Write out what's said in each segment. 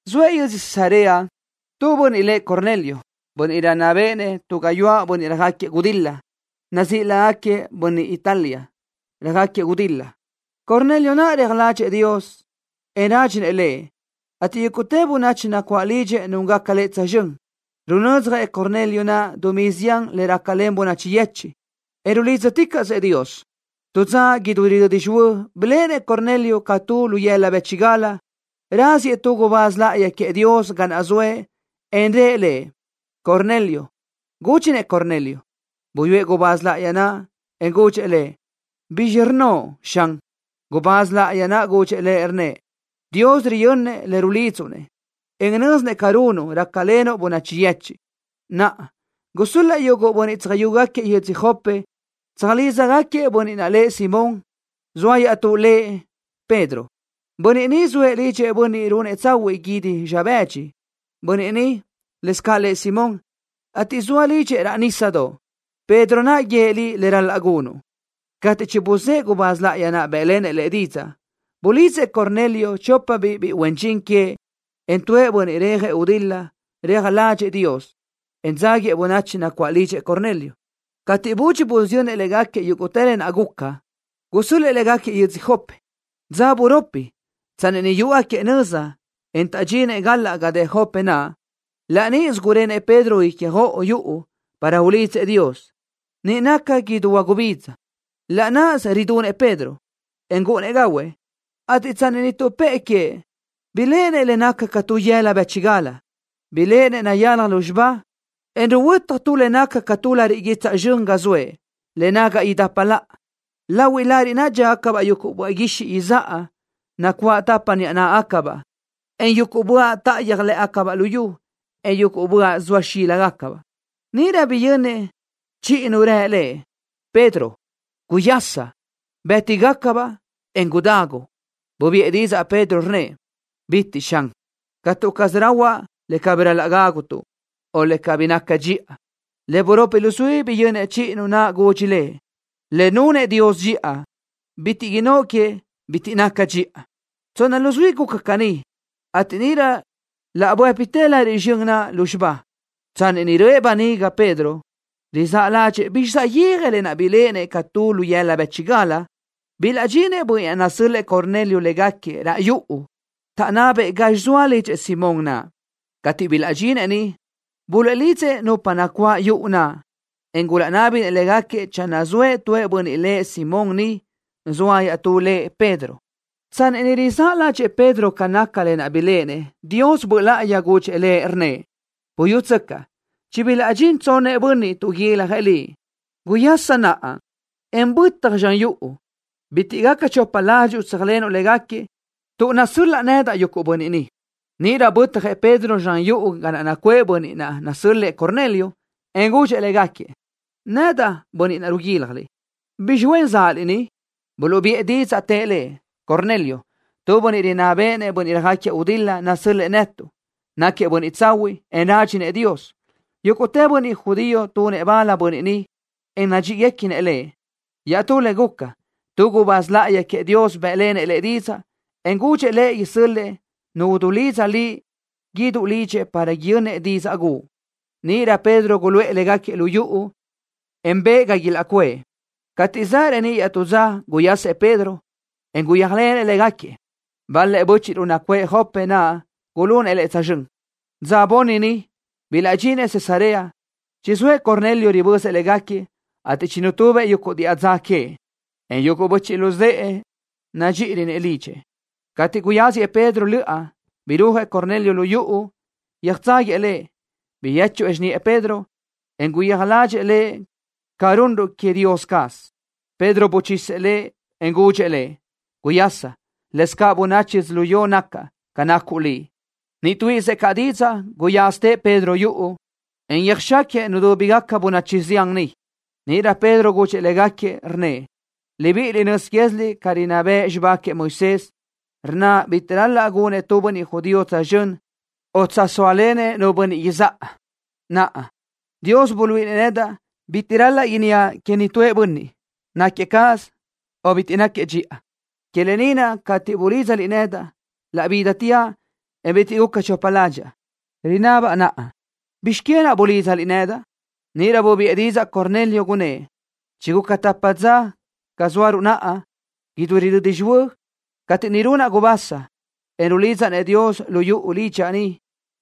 Zoëʼ yödzö Cesarea tu bönniʼ lëʼ Cornelio, bönniʼ rinná béʼenëʼ tu gáyuʼë bönniʼ röjáquiëʼ gudil-la, nazíʼi lágaquiëʼ Bönniʼ Italia Röjáquiëʼ Gudil-la. Cornelio naʼ reaj ládxëʼë Dios, en rádxinëʼ Lëʼ, ateʼ yúguʼtë bönachi nacuáʼ lidxëʼ núngaca lëʼ tsözxö́n. Runödzjëʼ Cornelio dumí zián le rácalen bönachi yechiʼ, en rulídzaticaʼsëʼ Dios. Tu dza idú ridödi xihuö́ biléʼenëʼ Cornelio ca tu lu yëla bë́chigal, raziëʼ tu gubáz láʼayi queëʼ Dios ga naʼ zoëʼ, en rëʼ lëʼ: —Cornelio. Gúdxinëʼ Cornelio. Buyúëʼ gubáz láʼayi naʼ, en gudxëʼ lëʼ: —¿Bizxi rnnoʼ, Xan? Gubáz láʼayi naʼ gudxëʼ lëʼ, rnnëʼ: —Dios riyönnëʼ le rulidzuʼ-nëʼ, en nö́zinëʼ ca runuʼ, rácalenuʼ bönachi yechiʼ. Naʼa, gusö́l-laʼ yuguʼ bönniʼ tsöjáquiëʼ yödzö Jope tsöjlídzagaquiëʼ bönniʼ naʼ lëʼ Simón, zoa iaʼtú lëʼ Pedro. Bönniʼ ni zoëʼ lidxëʼ tu bönniʼ runëʼ tsahuiʼ guídi zxa bëdxi. Bönniʼ ni, lëscaʼ lëʼ Simón, ateʼ zoa lidxëʼ raʼ nísadoʼ. Pedro naʼ guíëʼ liʼ le ral-laʼ gunuʼ. Cateʼ chibuzë́ʼë gubáz láʼayi naʼ bë́ʼlenëʼ lëʼ didzaʼ, bulidzëʼ Cornelio chópabiʼ biʼi huen dxin queëʼ, en tuëʼ bönniʼ rejëʼ gudil-la reaj ládxëʼë Dios, en dzáguiëʼ bönachi nacuáʼ lidxëʼ Cornelio. Cateʼ budxi busiyönnëʼ légaquiëʼ yúguʼtë le guca, gusö́l-lëʼë légaquiëʼ yödzö Jope. Dza buropi, tsanni niʼ yúʼugaquiëʼ nöza, en taʼdxinëʼ galaʼ ga dë Jope naʼ, laʼ níʼisö gurenëʼ Pedro ícjoʼolö yuʼu para ulidzëʼ Dios, niʼ naca idú huagubidza. Laʼ náʼasö ridunëʼ Pedro, en gúʼunnëʼ gahuëʼ, ateʼ tsanni niʼ tuʼpë́ʼë queëʼ, biléʼenëʼ le naca ca tu lu yëla bë́chigal. Biléʼenëʼ nayalaj lúzxiba, en ruhuötaj tu le naca ca tu lariʼ guitsaʼ zxön ga zoëʼ, le nagaʼ idapa laʼa. Lahui lariʼ naʼ dxíagacabaʼ yuguʼ böaʼ guixiʼ izáʼa nacuáʼ tapa niʼa náʼagacabaʼ, en yuguʼ böaʼ táʼayöj lë́ʼegacabaʼ lu yu, en yuguʼ böaʼ zoa xíligacabaʼ. Níʼirö biyönnëʼ chiʼi nu rë lëʼ: —Pedro, guyasa. Bë́ti-gacabaʼ, en gudagu. Bubiʼë didzaʼ Pedro, rnnëʼ: —¡Calëga, Xan! Catu caz gudahuaʼ le cabí ral-laʼ gágutuʼ, o le cabí naca dxiʼa. Le buropi luzuí biyönnëʼ chiʼi nu naʼ gudxi lëʼ: —Le nunëʼ Dios dxiʼa, bitiʼ innóʼ que: “Bitiʼ naca dxiʼa.” Tsonna luzuí guca caní, ateʼ níʼirö laʼ buë́pitë lariʼ zxön naʼ lúzxiba. Tsanni niʼ röʼë böniga Pedro, rizáʼ ládxëʼë bizxi saʼyéaj lë naʼ biléʼenëʼ ca tu lu yëla bë́chigal, bilaʼdxinëʼ bönniʼ naʼ nasö́l-lëʼë Cornelio légaquiëʼ raʼ yuʼu, taʼnabëʼ gazxi zoa lidxëʼ Simón naʼ. Cateʼ bilaʼdxinëʼ niʼ, buluʼlidzëʼ nupa nacuáʼ yuʼu naʼ, en gulaʼnábinëʼ légaquiëʼ channö zoëʼ tu bönniʼ lëʼ Simón niʼ, zoa iaʼtú lëʼ Pedro. Tsanni niʼ rizáʼ ládxëʼë Pedro ca naca lë naʼ biléʼenëʼ, Dios Böʼ Láʼayi gudxëʼ lëʼ, rnnëʼ: —Buyútsöcaʼ. Chibilaʼdxinëʼ tsonnëʼ bönniʼ ni, tuʼguiljëʼ liʼ. Guyaschi naʼa, en bötaj zxan yuʼu. Bitiʼ gaca chopa ládxuʼu tséajlenuʼ légaquiëʼ, tuʼ nasö́l-laʼa nedaʼ yuguʼ bönniʼ ni. Níʼirö bötjëʼ Pedro zxan yuʼu ga naʼ nacuʼë bönniʼ naʼ nasö́l-lëʼë Cornelio, en gudxëʼ légaquiëʼ: —Nedaʼ bönniʼ ruguílajliʼ. ¿Bizxi huen záʼaliʼ ni? Buluʼbiʼë didzaʼ, tëʼ lëʼ: —Cornelio, tu bönniʼ rinná béʼenëʼ bönniʼ röjáquiëʼ gudil-la, nasö́l-lëʼë netuʼ. Náquiëʼ bönniʼ tsahuiʼ, en rádxinëʼ Dios. Yúguʼtë bönniʼ judío tunëʼ bal bönniʼ ni, en nadxíʼiguequinëʼ lëʼ. Iaʼtú le guca, tu gubáz láʼayi queëʼ Dios bë́ʼlenëʼ lëʼ didzaʼ, en gudxëʼ lëʼ isö́l-lëʼë nu udulídza liʼ guíduʼ lidxëʼ para yönnëʼ didzaʼ guʼu. Níʼirö Pedro guluʼë légaquiëʼ lu yuʼu, en bëʼë ga ilaʼcuʼë. Cateʼ zaʼ reníʼ iaʼtú dza, guyasëʼ Pedro, en guyéajlenëʼ légaquiëʼ. Bal-lëʼ bö́chiʼruʼ nacuʼë Jope naʼ gulunëʼ lëʼ tsözxö́n. Dza bunni niʼ, bilaʼdxinëʼ Cesarea. Chizóëʼ Cornelio ribözëʼ légaquiëʼ, ateʼ chinutubëʼ yuguʼ diʼa dza queëʼ, en yuguʼ böchiʼ luzë́ʼë nadxíʼirönëʼ lidxëʼ. Cateʼ guyáziëʼ Pedro löʼa, birúajëʼ Cornelio yuʼu, yöjtságuiëʼ lëʼ. Biyéchuëʼ xiniʼë Pedro, en guyéaj ládxëʼë lëʼ ca runruʼ queëʼ Dios caz. Pedro buchisëʼ lëʼ, en gudxëʼ lëʼ: —Guyasa. Lëscaʼ bönachi yödzölió nacaʼ ca nacuʼ liʼ. Niʼ tuíʼisëʼ caʼ didzaʼ, guyázatëʼ Pedro yuʼu, en yöjxáquiëʼ nudúbigaca bönachi zián niʼ. Níʼirö Pedro gudxëʼ légaquiëʼ, rnnëʼ: —Libiʼiliʼ nöz quéziliʼ ca rinná bëʼ xibá queëʼ Moisés, rnna bitiʼ ral-laʼ gunëʼ tu bönniʼ judío tsözxö́n o tsázalenëʼ nu bönniʼ izáʼa. Naʼa, Dios buluíʼinëʼ nedaʼ bitiʼ ral-laʼ inníaʼ queëʼ nitúëʼ bönniʼ náquiëʼ cáʼasö o bitiʼ náquiëʼ dxiʼa. Que lë ni naʼ cateʼ bulídzaliʼ nedaʼ, laʼ bídateaʼ, en bitiʼ guca chopa ládxaʼa. Rinabaʼ naʼa, ¿bizx que naʼ bulídzaliʼ nedaʼ? Níʼirö bubiʼë didzaʼ Cornelio, gunnë́ʼ: —Chiguca tapa dza ca zóaruʼ naʼa, idú ridödi xihuö́, cateʼ niʼ runaʼ gubasa, en rulidzaʼ-nëʼ Dios lu yuʼu lidxaʼ ni,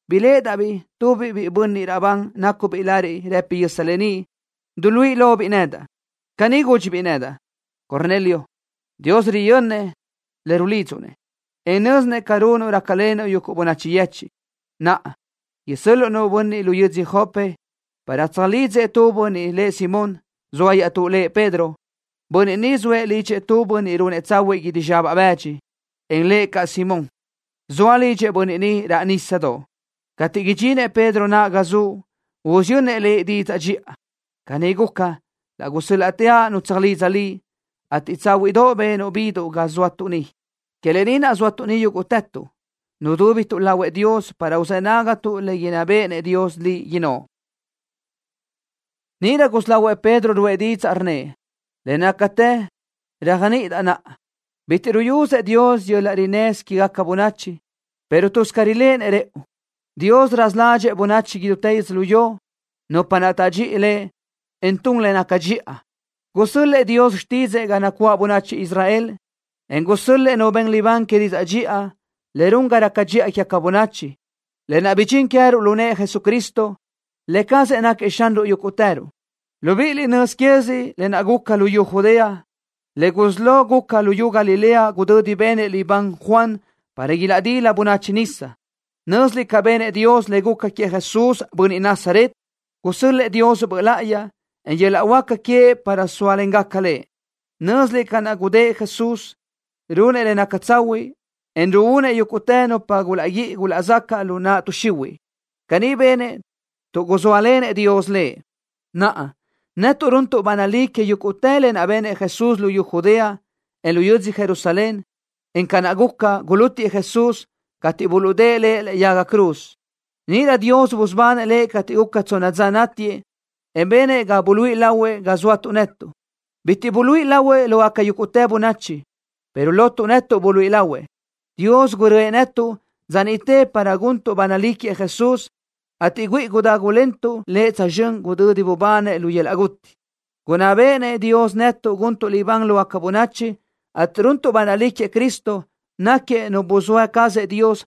biléʼedaʼ-biʼ tubiʼ bönniʼ raʼbán nácubiʼ lariʼ rëpi yösa beníʼ, duluíʼi lobiʼ nedaʼ. Caní gúdxibiʼ nedaʼ: “Cornelio. Dios riyönnëʼ le rulidzuʼ-nëʼ, en nö́zinëʼ ca runuʼ, rácalenuʼ yuguʼ bönachi yechiʼ. Naʼa, isö́l-luʼu nu bönniʼ lu yödzö Jope para tsöjlídzëʼ tu bönniʼ lëʼ Simón, zoa iaʼtú lëʼ Pedro. Bönniʼ ni zoëʼ lidxëʼ tu bönniʼ runëʼ tsahuiʼ guídi zxa bëdxi, en lëʼ caʼ Simón. Zoa lidxëʼ bönniʼ ni raʼ nísadoʼ. Cateʼ idxinëʼ Pedro naʼ ga zuʼ, usiyönnëʼ liʼ didzaʼ dxiʼa.” Caní guca, laʼ gusö́l-laʼteaʼ nu tsöjlidzaʼ liʼ, ateʼ tsáhuiʼdoʼ benuʼ biduʼ ga zóatuʼ ni. Que lë ni naʼ zóatuʼ ni yúguʼtëtuʼ, nudúbituʼ lahuëʼ Dios para uzë́ nágatuʼ le inná béʼenëʼ Dios liʼ innóʼ. Níʼirö gusí lahuëʼ Pedro ruʼë didzaʼ, rnnëʼ: —Le nácatë réajniʼidaʼ naʼa, bitiʼ ruyusëʼ Dios yöl-laʼ rinnësö quégaca bönachi, pero tuz ca riléʼenëʼ rëʼu. Dios raza ládxëʼë bönachi idútë yödzölió, nupa naʼ tadxi Lëʼ, en tun le naca dxiʼa. Gusö́l-lëʼë Dios xtídzëʼë ga nacuáʼ bönachi Israel, en gusö́l-lëʼë nu ben libán que didzaʼ dxiʼa, le run ga raca dxiʼa quégaca bönachi, lë naʼ bidxín queë́ruʼ lu nëʼë Jesucristo. Lë cazëʼ náquiëʼ Xanruʼ yúguʼtëruʼ. Libíʼiliʼ nöz quéziliʼ lë naʼ guca luyú Judea, le gusí lo guca luyú Galilea gudödi benëʼ libán Juan para ilaʼdila bönachi nisa. Nö́ziliʼ ca benëʼ Dios le guca queëʼ Jesús, bönniʼ Nazaret. Gusö́l-lëʼë Dios Böʼ Láʼayi, en yöl-laʼ huáca queëʼ para sóalengaca Lëʼ. Nö́ziliʼ ca naʼ gudë́ʼ Jesús, runëʼ le naca tsahuiʼ, en ruúnëʼ yúguʼtë nupa gulaʼguíʼi gulaʼzacaʼ lu naʼ tuʼ xihuiʼ. Caní benëʼ, tuʼ guzóalenëʼ Dios Lëʼ. Naʼa, netuʼ runtuʼ ba nalí que yúguʼtë lë naʼ benëʼ Jesús luyú Judea, en lu yödzö Jerusalén, en ca naʼ guca, gulútiëʼ Jesús, cateʼ buluʼdë́ʼë Lëʼ lëʼe yaga cruz. Níʼirö Dios busubanëʼ Lëʼ cateʼ guca tsonna dza nátiëʼ, en benëʼ ga buluíʼi lahuëʼ ga zóatuʼ netuʼ. Bitiʼ buluíʼi lahuëʼ lógaca yúguʼtë bönachi, pero lotuʼ netuʼ buluíʼi lahuëʼ. Dios gurö́ëʼ netuʼ dza niʼte para guntuʼ ba nalí queëʼ Jesús, ateʼ güíʼi gudágulentuʼ Lëʼ tsözxö́n gudödi bubanëʼ lu yöl-laʼ guti. Gunná béʼenëʼ Dios netuʼ guntuʼ libán lógaca bönachi, ateʼ runtuʼ ba nalí queëʼ Cristo, náquiëʼ Nu buzóa cazëʼ Dios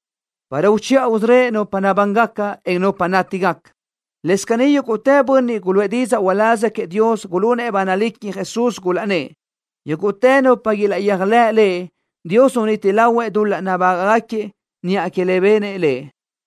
para uchiʼa usörö́ëʼ nupa nabángaca, en nupa chinátigaca. Lëscaʼ yúguʼtë bönniʼ guluʼë didzaʼ uláz queëʼ Dios gulunëʼ ba nalí queëʼ Jesús, gulaʼnnë́ʼ: “Yúguʼtë nupa ilaʼyéajlëʼ Lëʼ, Dios uniti lahuëʼ dul-laʼ nabágaʼgaquiëʼ niʼa que le benëʼ Lëʼ.”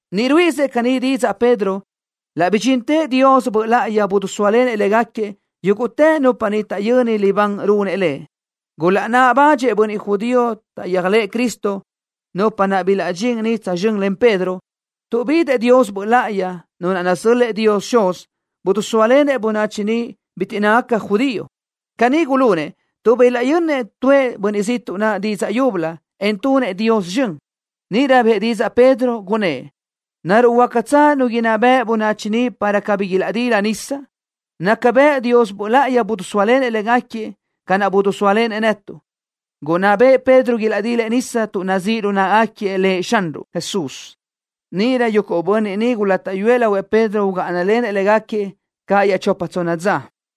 Niʼ ruíʼisëʼ caní didzaʼ Pedro, laʼ bidxintëʼ Dios Böʼ Láʼayi, bidisóalenëʼ légaquiëʼ, yúguʼtë nupa niʼ taʼyöni libán runëʼ lëʼ. Gulaʼnáʼ badxëʼ bönniʼ judío taʼyéajlëʼë Cristo, nupa naʼ bilaʼdxín niʼ tsözxö́n len Pedro, tuʼ bidëʼ Dios Böʼ Láʼayi, Nu naʼ nasö́l-lëʼë Dios Xuz. Bidisóalenëʼ bönachi niʼ bitiʼ nácagaca judío. Caní gulunëʼ tuʼ bilaʼyönnëʼ tuʼë bönniʼ ziʼtuʼ naʼ didzaʼ yúbölö, en tunëʼ Dios zxön. Níʼirö bëʼë didzaʼ Pedro, gunnë́ʼ: —¿Naruʼ huácatsö nu inná beʼe bönachi ni para cabí ilaʼdila nisa? Naca bëʼ Dios Böʼ Láʼayi bidisóalenëʼ légaquiëʼ, ca naʼ bidisóalenëʼ netuʼ. Gunná bëʼë Pedro ilaʼdilëʼ nisa tuʼ nazíʼ lu náʼagaquiëʼ Lëʼ Xanruʼ Jesús. Níʼirö yuguʼ bönniʼ niʼ gulátaʼyuëʼ lahuëʼ Pedro ugáʼanalenëʼ légaquiëʼ ca chopa tsonna dza.